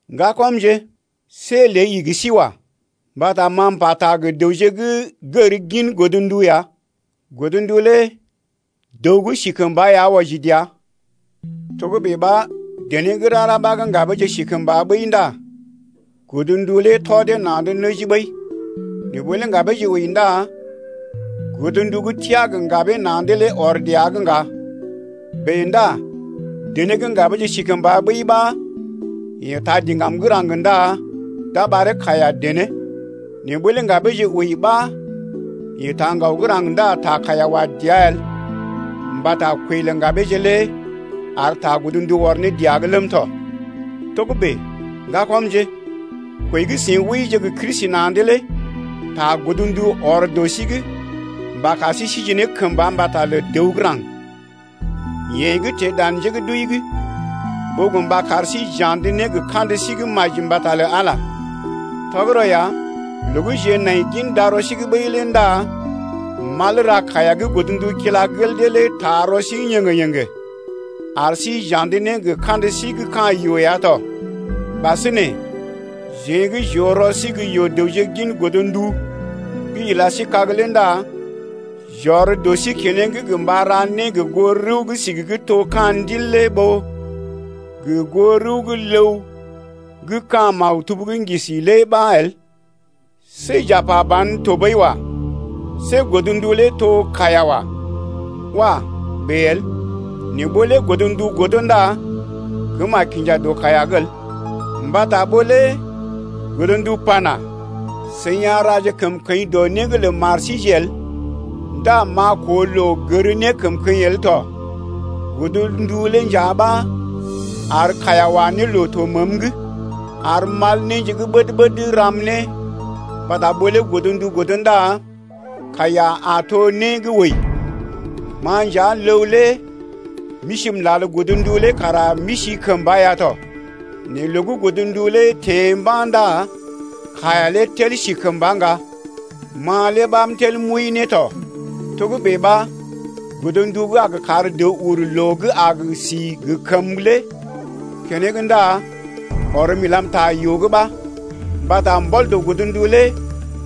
Ŋgakɔmje, see lée igi sí wa. Mbata ma m’pata gə dəwje gə́ gər gin godndu ya. Godndu lé dəw gə́ si kəmba ya wɔji dəa. Togə́bè ɓa dené gə́ rara ɓa gə́ ŋgabeeje si kəmba ɓəi ndá godndu lé tɔ dee na̰’d nəji ɓəi, nɛ ɓó lé ŋgabeeje wəi ndá godndu gə́ teá gə ŋgabee na̰’d lé ɔr dəa’g ŋga. Bèe ndá dené gə́ ŋgabeeje si kəmba ɓəi ɓa yeḛ taa diŋgam gə́ raŋg ndá d’a ɓaree kaiya-dené. Nɛ ɓó lé ŋgabeeje wəi ɓa yeḛ taa ŋgaw gə́ raŋg ndá ta kaiya wa dəa el mbata kwəi lə ŋgabeeje lé ar ta godndu ɔr ne dəa’g ləm tɔ. Togə́bè, ŋgakɔmje, kwəi gə́ seḭ wəije gə Kristi na̰’d lé ta godndu ɔr dɔ sí’g mba kar sí sije ne kəmba mbata lə dəw gə́ raŋg, yeḛ gə́ teḛ dan njé gə́ d’wəi’g, ɓó gə mba kar sí j’andə ne gə kandə sí gə́ maji mbata lə Ala ya. Tɔgərɔ ya, loo gə́ jeḛ nai gin darɔ’g ɓəi lé ndá mal ra kaiya gə́ godndu kila gel dee lé taa rɔ sí yéŋgé-yéŋgé ar sí j’andə ne gə kandə sí gə́ ka̰ yoo ya tɔ. Ɓasinè, jeḛ gə́ j’oo rɔ sí gə́ yoo-dəwje gin godndu gə́ ila sí kag lé ndá j’ɔr dɔ sí keneŋ gə mba ra né gə goo rəw gə́ sigi gə́ to ka̰ ndil lé ɓó gə goo rəw gə́ ləw gə́ ka̰ maktub gə́ ŋgisi lé ɓa el. See j’a pa ban tɔɓəi wa. See godndu lé to kaiya wa. Wah! bèe el. Né ɓó lé godndu godo ndá kəm a kinja dɔ kaiya’g el. Mbata ɓó lé godndu pana: I a ra kəmkəḭ dɔ né’g lə mari el, ndá m’a koo loo gər nékəmkəḭ el tɔ. Godndu lé nja ɓa ar kaiya wa ne loo to məəm’g, ar mal néje gə́ ɓəd-ɓəd ram ne, mbata ɓó lé godndu godo ndá kaiya a to né gə́ wəi. Ma nja ləw lé m’isi m’lal godndu lé kara m’isi kəmba ya tɔ. Nɛ loo gə́ godndu lé teḛ mba̰ ndá kaiya lé tel si kəmba ŋga, ma lé ɓa m’tel m’wəi ne tɔ. Togə́bè ɓa godndu gə́ a gə kar dəw ur loo gə́ a gə si gə kəmə lé keneŋ ndá ɔrm ilam ta yoo’g ɓa. Mbata mbɔl dɔ godndu lé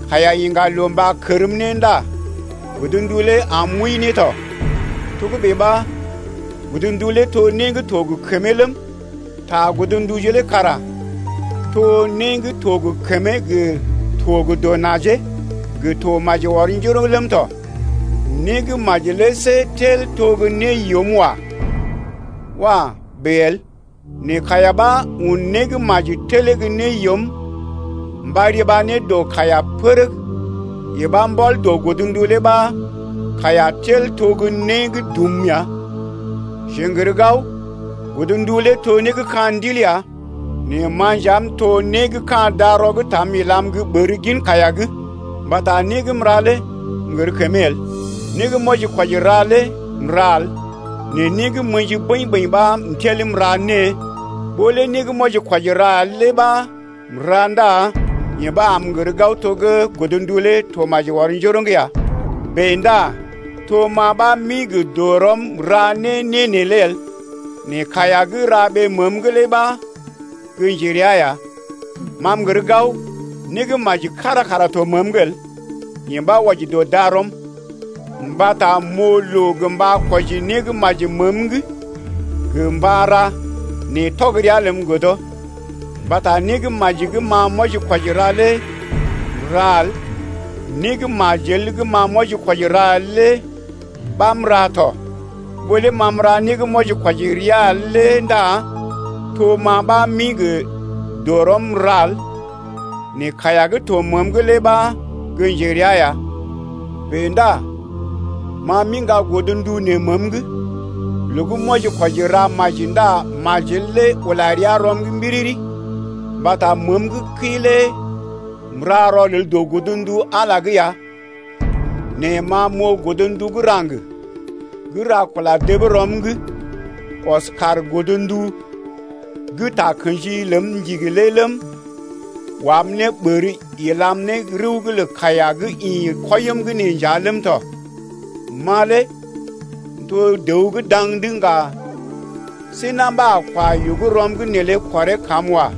kaiya iŋga ne loo mba kərm ne ndá godndu lé am m’wəi ne tɔ. Togə́bè ɓa godndu lé to né gə́ to gə kəmee ləm, ta godnduje lé kara to né gə́ to gə kəmee gə to gə dɔ najee gə to maji ɔr njoroŋ ləm tɔ. Né gə́ maji lé see tel to gə́ né yoom wa. Wah! bèe el. Nɛ kaiya ɓa un né gə́ maji telee gə́ né yoom mba riba ne dɔ kaiya pərəg. Yee ɓa mbɔl dɔ godndu lé ɓa kaiya tel to gə́ né gə́ dum ya. Jeḛ n’gər gao, godndu lé to né gə́ ka̰ ndil ya. Nɛ ma nja m’to né gə́ ka̰ darɔ gə́ taam ilam gə́ ɓər gin kaiya’g. Mbata né gə́ m’ra lé m’gər kəmee el, né gə́ m’wɔji-kwɔji ra lé m’ra el nɛ né gə́ m’ə̰ji bəḭ-bəḭ ɓa m’tel m’ra. Ɓó lé né gə́ m’wɔji-kwɔji ra el lé ɓa m’ra ndá yee ɓa am m’gər gao to gə́ godndu lé to maji ɔr njoroŋ ya. Bèe ndá to ma ɓa m’ḭ gə dɔrɔm m’ra né neelé el nɛ kaiya gə́ ra ɓee məəm’g lé ɓa gə́ njerea ya. Ma m’gər gao, né gə́ maji kára kara to məəm’g el, yee ɓa wɔji dɔ darɔm, mbata m’oo loo gə mba kwɔji né gə́ maji məəm’g gə mba ra nɛ tɔg rəa ləm godo. Mbata né gə́ maji gə́ ma m’wɔji-kwɔji ra lé m’ra el, né gə́ majel gə́ ma m’wɔji-kwɔji ra el lé ɓa m’ra tɔ. Ɓó lé ma m’ra né gə́ m’wɔji-kwɔji rəa el lé ndá to ma ɓa m’ḭ gə dɔrɔm m’ra el, nɛ kaiya gə́ to məəm’g lé ɓa gə́ njerea ya. Bèe ndá ma m’iŋga godndu nee məəm’g: loo gə́ m’wɔji-kwɔji ra maji ndá majel lé ula rəa rɔm’g mbiriri. Mbata məəm gə́ kəi lé m’ra rɔlel dɔ godndu Ala’g ya nɛ ma m’oo godndu gə́ raŋg gə́ ra kula dəb rɔm’g ɔs kaar godndu gə́ takə̰ji ləm ndigi lé ləm, wam ne ɓər ilam ne rəw’g lə kaiya gə́ ḭ kwɔim’g ne nja ləm tɔ. Ma lé m’to dəw gə́ daŋ’d ŋga! See na̰ ɓa a kwa yoo gə́ rɔm’g neelé kɔree kam wa.